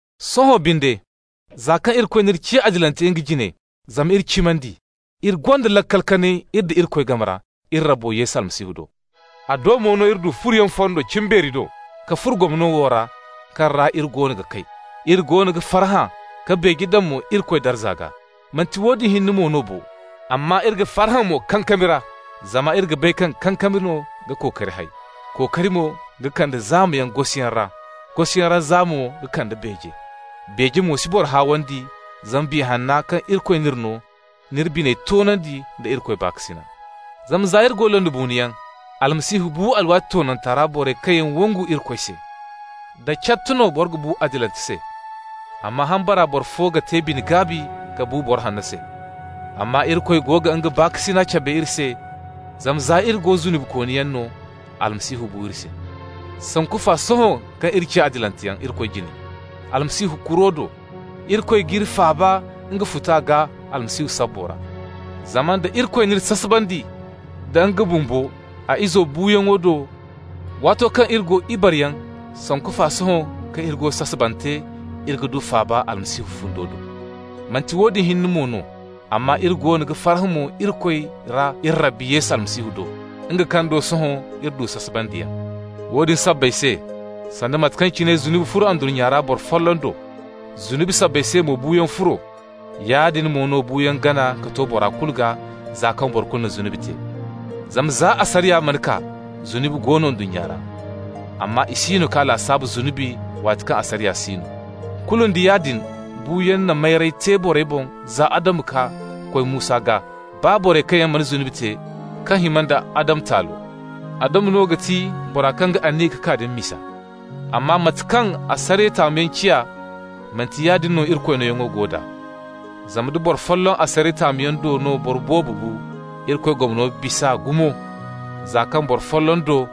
Sohõ binde, za kaŋ Irikoy n'iri ciya adilante nga jine zama iri cimandi, iri gonda laakal kanay iri nda Irikoy game ra, iri Rabbi Yesu Almasihu do. A do mo no iri du furoyaŋ fondo cimbeeri do, ka furo gomno wo ra, kaŋ ra iri goono ga kay. Iri goono ga farhã ka beeje daŋ mo Irikoy darza gaa. Manti woodin hinne mo no bo, amma iri ga farhã mo kankami ra, zama iri ga bay kaŋ kankami no ga kookari hay. Kookari mo ga kande zaama gosiyaŋ ra, gosiyaŋ ra zaama mo ga kande beeje. Beeje mo si boro haawandi, zama Biya Hanna, kaŋ Irikoy n'iri no, n'iri biney toonandi da Irikoy baakasina. Zama za iri go londibuunoyaŋ, Almasihu bu alwaati toonanta ra borey kaŋ yaŋ wangu Irikoy se. Da cat no boro ga bu adilante se, amma hambara boro fo ga te bine-gaabi ka bu boro hanno se. Amma Irikoy go ga nga baakasina cabe iri se, zama, za iri go zunubikooniyaŋ no, Almasihu bu iri se. Sanku fa, sohõ kaŋ iri ciya adilanteyaŋ Irikoy jine Almasihu kuro do, Irikoy g'iri faaba nga futa gaa Almasihu sabbo ra. Zama nda Irikoy n'iri sasabandi nda nga bumbo a Izo buuyaŋo do waato kaŋ iri go ibareyaŋ, sanku fa sohõ kaŋ iri go sasabante iri ga du faaba Almasihu fundo do. Manti woodin hinne mo no, amma iri goono ga farhã mo Irikoy ra iri Rabbi Yesu Almasihu do, nga kaŋ do sohõ iri du sasabandiyaŋ. Woodin sabbay se, sanda mate kaŋ cine zunubi furo ndunnya ra boro folloŋ do, zunubi sabbay se mo buuyaŋ furo, yaadin mo no buuyaŋ gana ka to bora kulu gaa, za kaŋ boro kulu na zunubi te. Zama za asariya mana kaa, zunubi go no ndunnya ra, amma i siino g'a lasaabu zunubi waati kaŋ asariya si no. Kulu nda yaadin buuyaŋ na mayray te borey boŋ za Adamu ka koy Musa gaa, baa borey kaŋ yaŋ mana zunubi te kaŋ hima nda Adamu taalo. Adamu no ga ti bora kaŋ ga aniya ka kaa din misa. Amma mate kaŋ asariya taamuyaŋ ciya, manti yaadin no Irikoy nooyaŋo go d'a. Zama nda boro folloŋ asariya taamuyaŋ do no boro boobo bu, Irikoy gomno bis'a gumo, za kaŋ boro folloŋ do,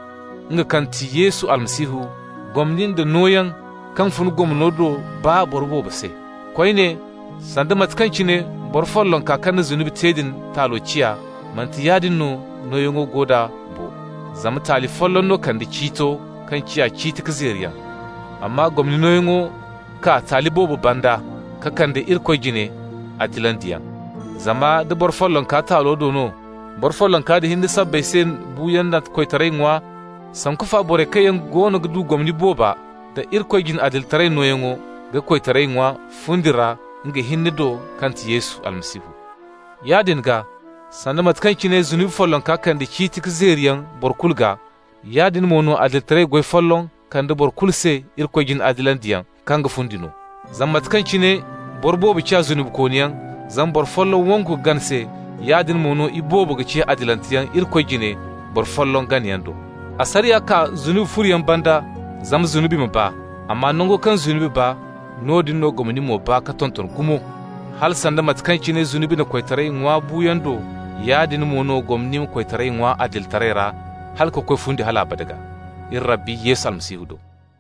nga kaŋ ti Yesu Almasihu, gomni nda nooyaŋ kaŋ fun gomno do baa boro boobo se. Koyne, sanda mate kaŋ cine boro follonka kaŋ na zunubi te din taalo ciya, manti yaadin no nooyaŋo go d'a bo, zama taali folloŋ no kande ciito kaŋ ciya ciiti ka zeeriyaŋ, amma gomni nooyaŋo kaa taali boobo banda ka kande Irikoy jine adilandiyaŋ. Zama nda boro follonka taalo do no, boro follonka din hinne sabbay se buuyaŋ na koytaray ŋwa, sanku fa borey kaŋ yaŋ goono ga du gomni booba da Irikoy jine adilitaray nooyaŋo ga koytaray ŋwa fundi ra nga hinne do kaŋ ti Yesu Almasihu. Yaadin gaa, sanda mate kaŋ cine zunubi folloŋ kande ciiti ka zeeriyaŋ boro kulu gaa, yaadin mo no adilitaray goy folloŋ kande boro kulu se Irikoy jine adilandiyaŋ kaŋ ga fundi no. Zama mate kaŋ cine boro boobo ciya zunubikooniyaŋ zama boro folloŋ wangu ka gana se, yaadin mo no iboobo ga ciya adilanteyaŋ Irikoy jine boro folloŋ ganayaŋ do. Asariya kaa zunubi furoyaŋ banda zama zunubi ma baa, amma nango kaŋ zunubi baa, noodin no gomni mo baa ka tonton gumo. Hala, sanda mate kaŋ cine zunubi na koytaray ŋwa buuyaŋ do, yaadin mo no gomni ma koytaray ŋwa adilitaray ra hala ka koy fundi hal abada gaa, iri Rabbi Yesu Almasihu do.